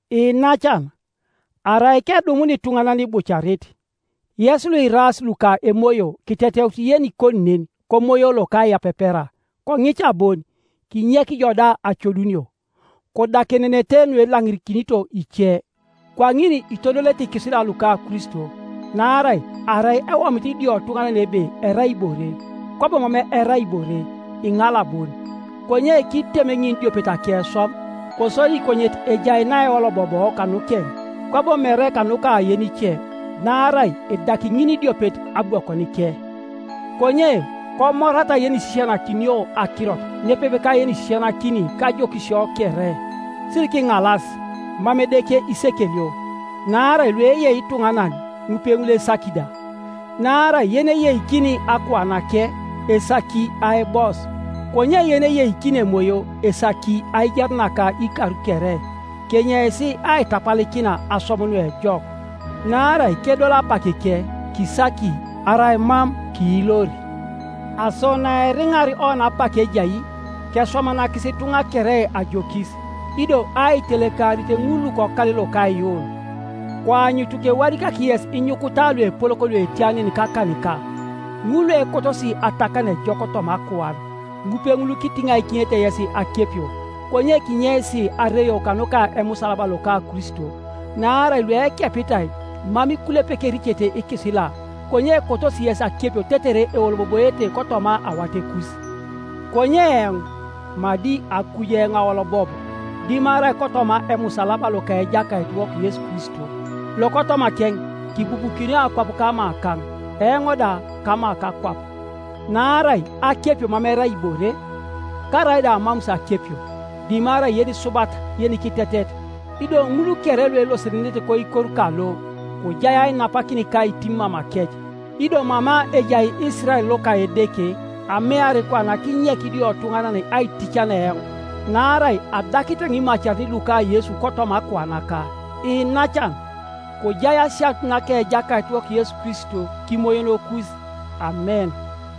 Iinacan, arai kedumun ituŋanan ibucarit, yes luiraas luka Emoyo kiteteut yenikoni nen komoyo lokaiyapepera. Koŋica bon, kinyek Ijo da acodunio. Kodakenenete nuelaŋirikinito ice, kwaŋin itodolete ikisila luka Kristo. Naarai arai ewomit idiotuŋanan ebe erai ibore, kwabo mam erai ibore, iŋala bon. Konye kitem ŋinidiopet akeswam, kosodi konyet ejai naeoloboboo kanukeŋ, kwabo mere kanuka yenice. Naarai edaki ŋinidiopet abwokonike. Konye komorata yenisisianakinio akirot nepepe ka yenisisianakini kajokisio kere. Sirikiŋalas; mam Edeke isekelio, naarai lueyei ituŋanan, ŋupeŋul esaki da. Naarai yeneyeikini akuanake, esaki aibos; konye yeneyeikini Emoyo, esaki aijar naka ikar kere. Kenyeis aitapalikina aswam nuejok, naarai kedol apakike kisaki, arai mam kiilor. Aso naeriŋar oni apak ejai, keswamanakisi ituŋa kere ajokis, ido aitelekarit ŋul lukokal loka aiyuun. Koanyutu kewadikak yes inyukuta luepolok luetia nen kakanika. Ŋul luekotosi atakan ejok toma akuan, ŋupeŋul kitiŋaikinete yes akepio, konye kinyeis areio kanuka emusalaba loka Kristo. Naarai luekepitai mam ikulepek ericete ikisila, konye ekotosi yes akepio tetere eoloboboete kotoma awatekus. Konye eoŋ madi akuj eoŋ aolobob, dimarai kotoma emusalaba loka Ejakaitiwok Yesu Kristo, lokotomakeŋ kibubukinio akwap kamakaŋ, eoŋ da kama kakwap. Naarai akepio mam erai ibore, karaida amamus akepio, dimarai yenisubat yenikitetet. Ido ŋul kere luelosenenete koikor kalo, kojai ainapakin ka aitim mamakec, ido mama ejai Isirael loka Edeke. Ameari kwana kinyek idiotuŋanan aitican eoŋ; naarai adakit eoŋ imacarin luka Yesu kotoma akuanaka. Iinacan, kojai asianut naka Ejakaitiwok Yesu Kristo kimoyonokus. Amen.